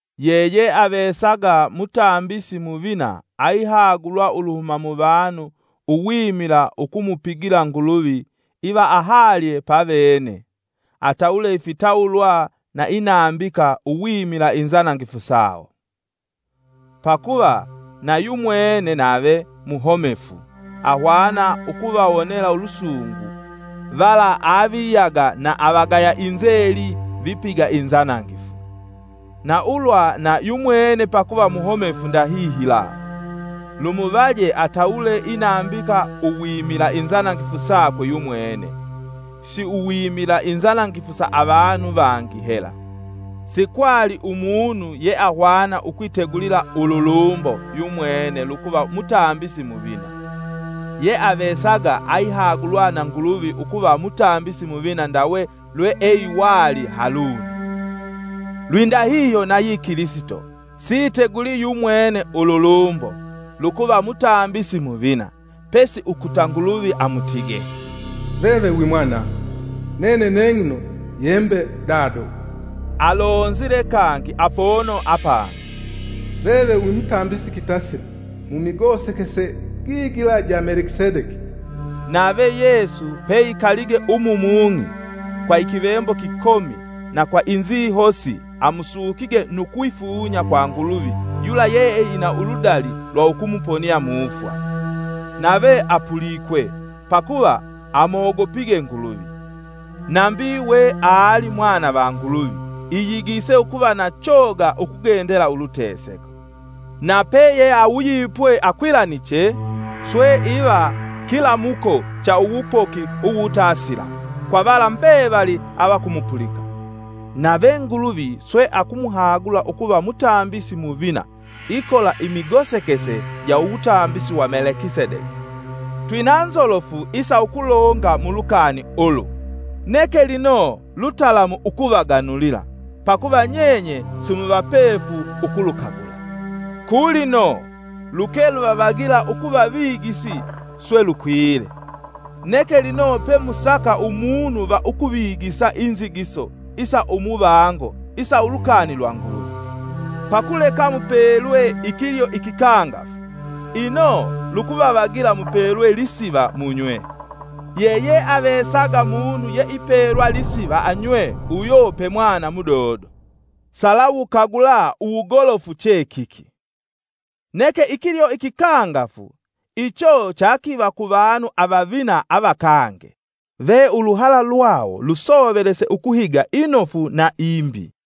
Yeyeavesaga Mutambisi muvina aihagulwa uluhuma muvanu uwimila ukumupigila Nguluvi iva ahalye pavene, atawule ifitawulwa na inambika uwimila inzanangifu sawo. Pakuva na yumwene nave muhomefu, ahwana ukuvawonela ulusungu vala aviyaga na avagaya inzeli vipiga inzanangifu. Na ulwa na yumwene pakuva muhomefu ndahihila, lumuvaje atawule inambika uwimila inzanangifu sakwe yumwene, siuwimila inzanangifu sa avanu vangi hela. Sikwali umunu yeahwana ukwitegulila ululumbo yumwene lukuva Mutambisi Muvina. Yeavesaga aihagulwa na Nguluvi ukuva Mumbisi Muvina ndawe lweeiwali Haluni. Lwindahihyo nayi Kilisito siitegulii yumwene ululumbo lukuva Mutambisi Muvina, pesi ukuta Nguluvi amutige: “Veve wi Mwanangu; Nene neng'ino yembe Dado.” Alonzile kangi apono apangi: “Veve wi mutambisi kitasila, mumigosekese gigila ja Melekisedeki.” Nave Yesu peikalige umu mung'i, kwa ikivembo kikomi na kwa inzihosi amusukige nu kwifunya kwa Nguluvi yula yeeina uludali lwa ukumuponia mufwa, nave apulikwe pakuva amogopige Nguluvi. Nambi, weali mwana va Nguluvi, iyigise ukuva na choga ukugendela uluteseko. Na peyeawuyipwe akwilaniche, swe iva kilamuko cha uwupoki uwutasila, kwa vala mbevali avakumupulika, nave Nguluvi swe akumuhagula ukuva Mutambisi Muvina ikola imigosekese ja uwutambisi wa Melekisedeki. Twina nzolofu isa ukulonga mu lukani ulu, neke lino lutalamu ukuvaganulila, pakuva nyenye simuvapefu ukulukagula. Ku lino luke luvavagila ukuva vigisi swe lukwile, neke lino pemusaka umunu va ukuvigisa inzigiso isa umuvango isa ulukani lwa Nguluvi. Pakuleka mupelwe ikilyo ikikangafu, ino lukuvavagila mupelwe lisiva munywe. Yeyeavesaga munu yeipelwa lisiva anywe uyo pe mwana mudodo, salawukagula uwugolofu chekiki. Neke ikilyo ikikangafu icho chakiva kuvanu avavina avakange, ve uluhala lwawo lwasoveliswe ukuhiga inofu na imbi.